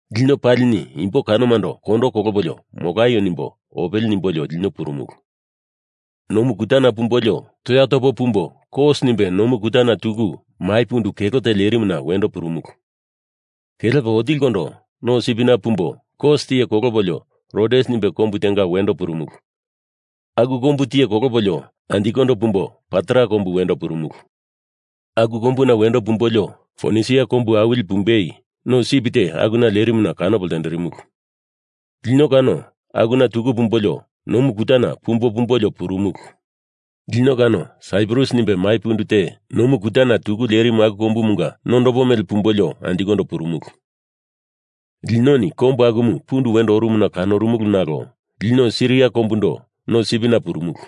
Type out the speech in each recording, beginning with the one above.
Lino palini imbo kanomando kondo kolopolio molaio nimbo opele nimbolio lino purumulu. Nomu kutana pumbolio toya topo pumbo Kos nimbe nomu kutana tuku mai pundu kelo te lerimuna wendo purumulu. Kelepo otilikondo no sipina pumbo Kos tiye kolopolio Rodes nimbe kombu tenga wendo purumulu. Aku kombu tiye kolopolio anjikondo pumbo Patara kombu wendo purumulu. Aku kombuna wendo pumbolio Fonisia kombu awili pumbei no sip te akuna lerimumu kanopo ltenderimulu. Lino kano akuna tuku pumbolio nomu kutana pumbo pumbolio purumulu. Lino kano Saiprus nimbe mai pundu te nomu kutana tuku lerimu aku kombumunga nondopo mele pumbolio anjikondo purumulu. Linoni kombu akumu pundu wendo orumuna kanorumulu nalo lino Siria kombundo no sipina purumulu.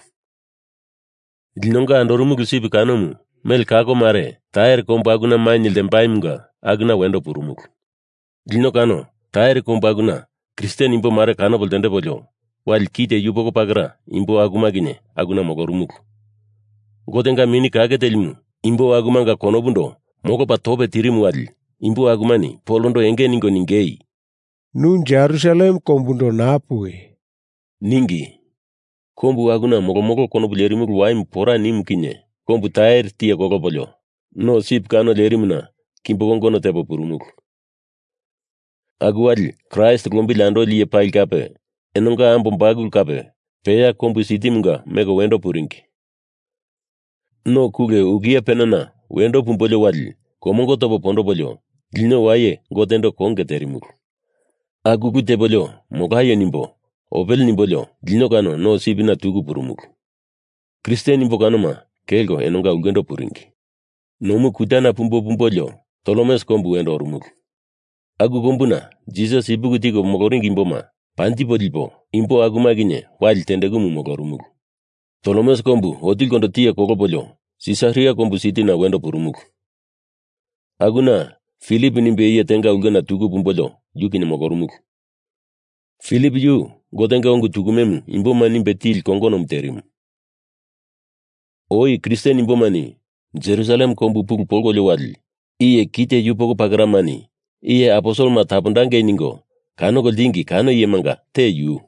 Linonga andorumulu sip kanomu mele kako mare Tair kombu akuna mainye ltembaimunga akuna wendo purumulu. Lino kano Tair kombu akuna Kristen imbo mare kanopo ltendepolio, wali kite yupoko pakera imbo akuma kinye akuna molorumulu. Gotenga Mini Kake Telimu imbo akumanga konopundo molopalie tope tirimu wali imbo akumani Polondo enge ningo ningei, “Nu Jerusalem kombundo naa puwi,” ningi. Kombu akuna molomolo konopu lerimulu waimu pora nimu kinye kombu Tair tiye kolopolio no sip kano lerimuna kimbo kongono tepo purumulu. Aku wali Kraist lombili andoli iye pali kape enonga ambo bakulu kape peya kombu sitimunga meko wendo puringi. No kule ukia penana wendo pumbolio wali komongo topo pondopolio lino waye Gotendo konge terimulu. Aku ulu tepolio molaio nimbo opele nimbolio lino kano no sipina tuku purumulu. Kristen imbo kanoma kelko enonga ulkendo puringi. Nomu kutana pumbo pumbolio Tolemes kombu wendo orumulu. Aku kombuna Jisas ipuki tiko moloringi imboma panjipo lipo imbo akuma kinye wali tendekumu molorumulu. Tolemes kombu otilikondo tiye kolopolio Sisaria kombu sitina wendo purumulu. Akuna Filip nimbe iye tenga ulkena tuku pumbolio yu kinye molorumulu. Filip yu Gotenga ungu tukume imboma nimbe tili kongonomu terimu. Oi Kristen imbomani Jerusalem kombu pulu polkolio wali iye kite yupoko pakeramani iye aposelema tapondangei ningo kanoko ltingi kano iyemanga te yu.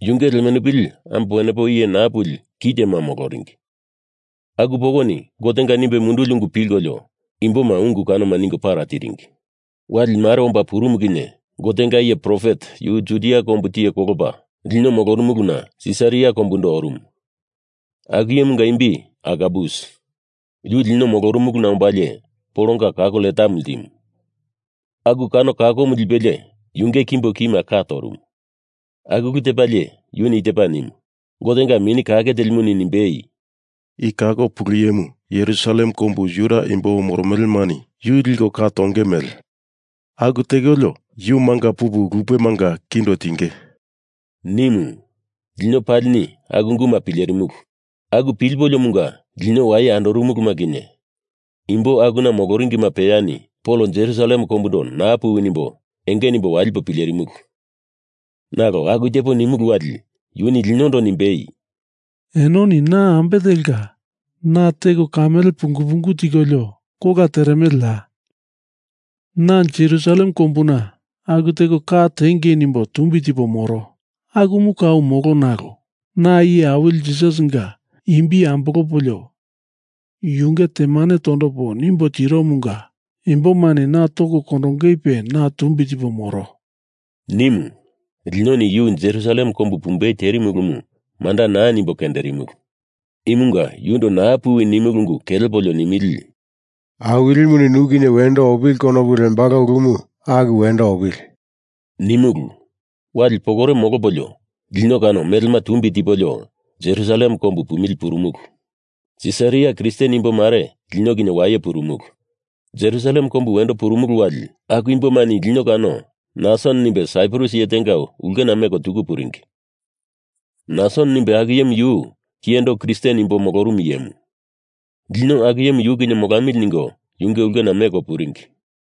Yunge lemenupili ambo wenepo iye naa puli kitema moloringi. Aku pokoni Gotenga nimbe munduli ungu pilkolio imboma ungu kanoma ningo para tiringi. Wali mare omba purumu kinye Gotenga iye profet yu Judia kombu tiye kolopa lino molorumuluna Sisaria kombundo orumu. Aku iyemunga imbi Agabus. Yu lino molorumuluna ombalie Polonga kako letamu ltimu. Aku kano kakomu lipelie yunge kimbo kima ka torumu. Aku ulu tepalie yuni i tepa nimu, Gotenga Mini Kake Telimuni nimbei, “I kako pulu iyemu Jerusalem kombu Juda imbo moromelemani yu liko ka tonge mele. Aku tekolio yu manga pupu lupemanga kindo tinge,” nimu. Lino palini aku unguma pilerimulu. Aku pilipoliomunga lino waye andorumuluma kinye imbo akuna moloringima peyani Pol Jerusalem kombundo naa puwi nimbo enge nimbo walipo pilerimulu. Nalo aku tepo nimulu wali yuni linondo nimbei, “Enoni na ambe telka na teko kamele pungu pungu tikolio kola teremeleya? Na Jerusalem kombuna aku teko ka tiengei nimbo tumbi tipo moro. Akumu kau molo. Nalo na Iye Awili Jisasinga imbi ambolopolio yunge temane tondopo nimbo tiromunga imbomani na toko kondongeipe na tumbi tipo moro,” nimu. Linoni yu Jerusalem kombu pumbei terimu ulumu manda naa nimbo kenderimulu. Imunga yundo naa puwi nimulu ungu kelepolio nimili, “Awilimuni nu kinye wendo opili konopu lembalo ulumu aku wendo opili,” nimulu. Wali pokore molopolio lino kano melema tumbi tipolio Jerusalem kombu pumili purumulu. Sisaria Kristen imbo mare lino kinye waye purumulu. Jerusalem kombu wendo purumulu wali aku imbomani lino kano Nason nimbe Saiprus iye tenga ulkena meko tuku puringi. Nason nimbe aku iyemu yu kiyendo Kristen imbo molorumu iyemu. Lino aku iyemu yu kinye molamili ningo yunge ulkena meko puringi.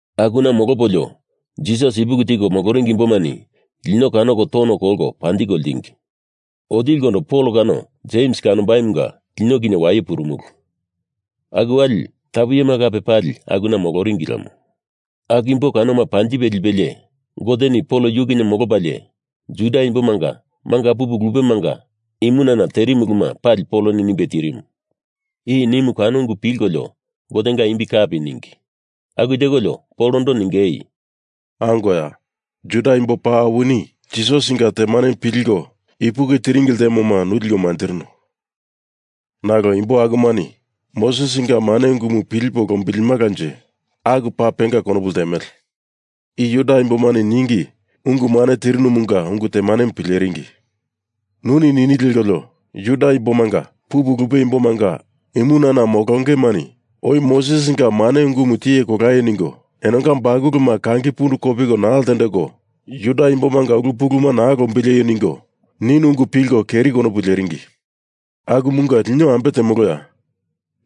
Akuna molopolio Jisas ipuki tiko moloringi imbomani lino kanoko tono kolko panjiko ltingi. Otilikondo Pol kano Jems kanombaimunga lino kinye waye purumulu. Aku wali tapu iyema kape, pali akuna moloringi lemo. Aku imbo kanoma panjipe lipelie Goteni Pol yu kinye molopalie Juda imbomanga manga pupu lupemanga imunana terimu uluma pali Poloni nimbe tirimu. I nimu kano ungu pilkolio Gotenga imbi kapi ningi. Aku tekolio Polondo ningei, “Angoya, Juda imbo paa awinini Jisasinga temanemu pilko ipuki tiringi ltemoma nu liko manjirino. Nalo imbo akumani Mosesinga mane ungumu pilipo lombilimalanje aku paa penga konopu ltemele. I Juda imbomani ningi ungu mane tirinumunga ungu temanemu pileringi. Nuni nini lekolio Juda imboma manga pupu lupe imbomanga imunana molongemani oi Mosesinga mane ungumu tiye kolaio ningo enonga bakuluma kangi pundu kopiko naa ltendeko Juda imbomanga ulu puluma naa lombileio ningo ninu ungu pilko keri konopu leringi. Akumunga lino ambe temoloya?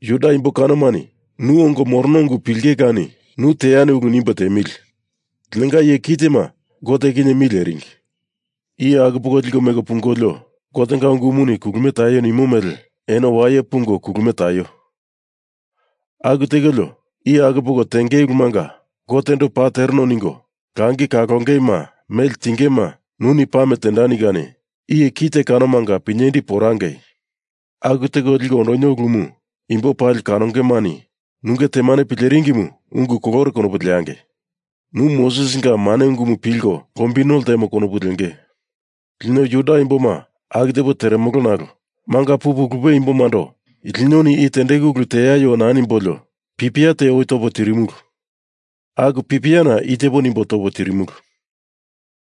Juda imbo kanomani nu ongo morono ungu pilinge kani nu teani ulu nimbo tiemili. Linonga iye kitema Gote kinye mi leringi. Iye aku poko liko meko pungolio Gotenga ungumuni kulumie taio nimo mele eno waye pungo kulumie taio. Aku tekolio iye aku poko tengei ulumanga Gotendo paa tereno ningo langi kalongeima mele tingema nuni pame tendani kani iye kite kanomanga pinyendi porangei. Aku teko liko ondonio ulumu imbo pali kanongemani nunge temane pileringimu ungu kolore konopu leangei. Nu Mosesinga mane ungumu pilko lombino ltemo konopu lenge. Lino Juda imboma aku tepo teremolo nalo manga pupu lupe imbomando linoni eno i tendeku ulu teaio naa nimbolio pipia te oi topo tirimulu. Aku pipiana i tepo nimbo topo tirimulu: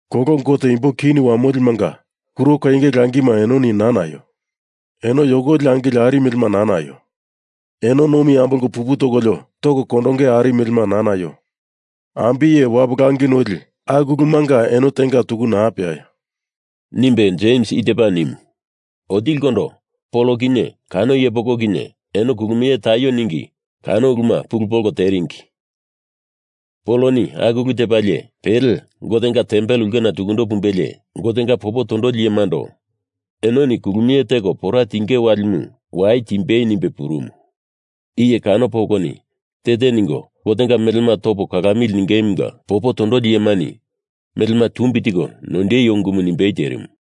Kolo gote imbo kini wamolimanga kuro koinge langima enoni naa naio. Eno yokoli angili ari melema naa naio. Eno nomi ambolko pupu tokolio toko kondonge ari melema naa naio. Ambiye wapu langi noli aku ulumanga eno tenga tuku naa peaio,” nimbe Jems i tepa nimu. Otilikondo Pol kinye kano iye poko kinye eno kulumie taio ningi kano uluma pulu mondoko teringi. Poloni aku ulu tepalie pele Gotenga tempel ulkena tukundo pumbelie Gotenga popo tondoli iyemando enoni kulumie teko pora tinge walimu wai timbei nimbe purumu. Iye kano pokoni te te ningo Gotendo melema toko kalamili ningemunga popo tondoli iyemani melema tumbi tiko noindeio ungumu nimbei terimu.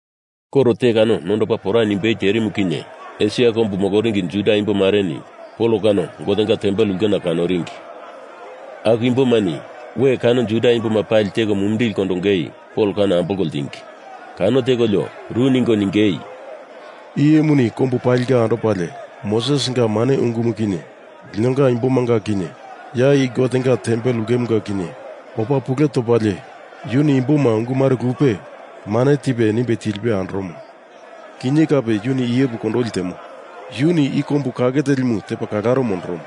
Koro te kano nondopa pora nimbei terimu kinye Esia kombu moloringi Juda imbomareni Pol kano Gotenga tempel ulkena kanoringi. Aku imbomani we kano Juda imboma pali teko mumindili kondongei Pol kano ambolko ltingi. Kano tekolio ru ningo ningei, “Iye imuni kombu palinga andopalie Mosesinga mane ungumu kinye linonga imbomanga kinye ya i Gotenga tempel ulkemunga kinye opa pule topalie yuni imboma ungu mare lupe mane tipe nimbe tilipe andoromo. Kinye kape yuni iyepu kondoli temo. Yuni i kombu kake telimu tepa kalaro mondoromo.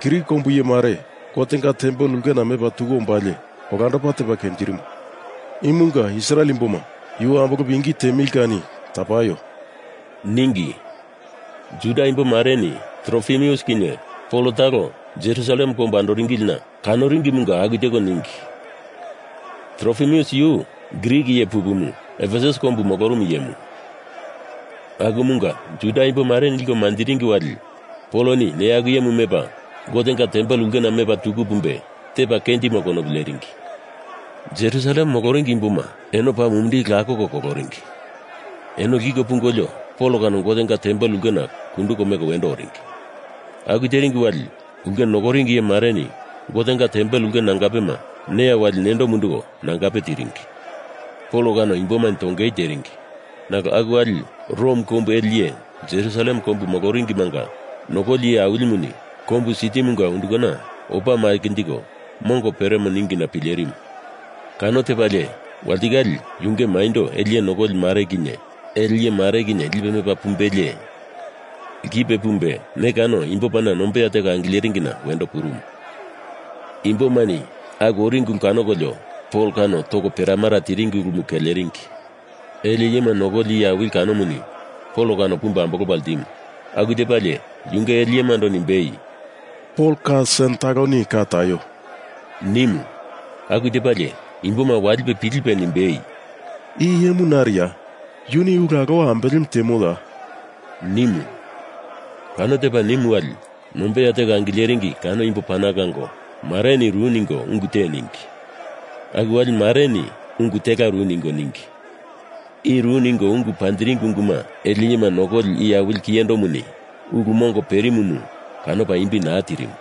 Grik kombu iye mare Gotenga tempel ulkena mepa tuku ombalie olandopa tepa kenjirimo. Imunga Israel imboma, yu ambolopo ingi tiemili kani tapaio,” ningi. Juda imbomareni Trofimus kinye Pol talo Jerusalem kombu andoringilina kanoringimunga aku teko ningi. Trofimus yu Grik iye pupumu Efesus kombu molorumu iyemu. Akumunga Juda imbomareni liko manjiringi wali Poloni neya aku iyemu mepa Gotenga tempel ulkena mepa tuku pumbe tepa kenjimo konopu leringi. Jerusalem kombu moloringi imboma eno paa mumindili lakoko koloringi. Eno lkiko pungolio Pol kano Gotenga tempel ulkena kunduko meko wendo oringi. Aku teringi wali ulke nokoringi iye mareni Gotenga tempel ulke nangapema neya wali nendo munduko nangape tiringi. Pol kano imbomani tongei teringi. Nalo aku wali Rom kombu ele iye Jerusalem kombu moloringimanga nokoli iye awilimuni kombu sitimunga undukana opa makinjiko mongo peremo ningina pilerimu. Kano tepalie walitikale yunge maindo ele iye nokoli mare kinye ele iyemare kinye lipe mepa pumbelie lkipe pumbe ne kano imbo pana nombeya teko angileringina wendo purumu. Imbomani aku oringi ulu kanokolio Pol kano toko peramara tiringi ulumu keleringi. Ele iyema nokoli iye awili kanomuni Pol kano pumbe ambolopa ltimu. Aku tepalie yunge ele iyemando nimbei, “Pol ka sen taloni ka taio,” nimu. Aku tepalie imboma walipe pilipe nimbei, “I iyemu nariya? Yuni ulu alowa ambelemu temoya?” nimu. Kano tepa nimu wali nombeya teko angileringi kano imbo pana kango mareni ru ningo ungu te ningi. Aku wali mareni ungu tela ru ningo ningi. I ru ningo ungu panjiringi ungumanga ele iyema nokoli iye awili kiyendomuni ulu mongo perimumu kanopa imbi naa tirimu.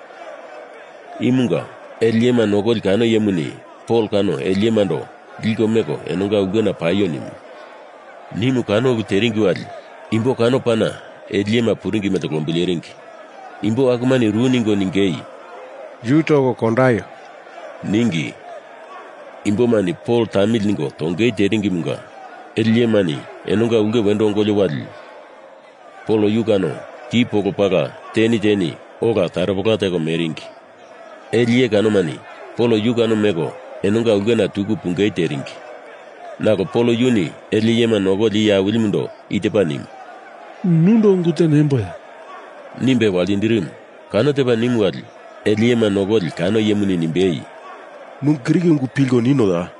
Imunga ele iyema nokoli kano iyemuni Pol kano ele iyemando liko meko enonga ulkena paio nimu. Nimu kano ulu teringi wali imbo kano pana ele iyema puringi mele lombileringi. Imbo akumani ru ningo ningei, “Yu toko kondaio,” ningi. Imbomani Pol tamili ningo tongei teringimunga ele iyemani enonga ulke wendo ongolio wali Pol yu kano ki polo pala, teni teni ola taropela teko meringi. Ele iye kanomani Pol yu kano meko enonga ulkena tuku pungei teringi. Nalo Pol yuni ele iyema nokoli iye awilimundo i tepa nimu, “Nundo ungu te nemboya?” nimbe waltindirimu. Kano tepa nimu wali ele iyema nokoli kano iyemuni nimbei, “Nu Grik ungu pilko ninoya?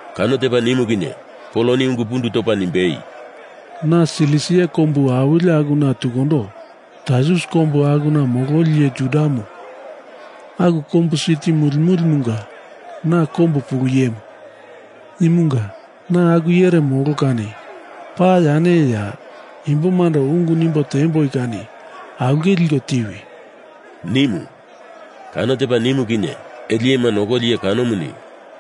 Kano tepa nimu kinye Poloni ungu pundu topa nimbei, “Na Silisia kombu awili akuna tukundo Tarsus kombu akuna mololi iye Judamu. Aku kombu siti muli mulimunga na kombu pulu iyemu. Imunga na aku iyere molo kani paa yane iye, ya imbomando ungu nimbo tiemboi kani aulke liko tiwi,” nimu. Kano tepa nimu kinye ele iyema nokoli iye kanomuni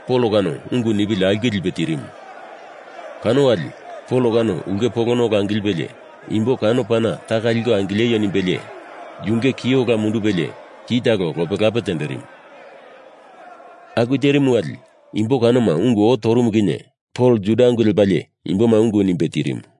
Pol kano ungu nipili aulke lipe tirimu. Kano wali Pol kano ulke polona ola angilipelie imbo kano pana taka liko angileio nimbelie yunge ki ola mundupelie ki talo lope lape tenderimu. Aku terimu wali imbo kanoma ungu oo torumu kinye Pol Juda ungu lepa imboma ungu nimbe tirimu.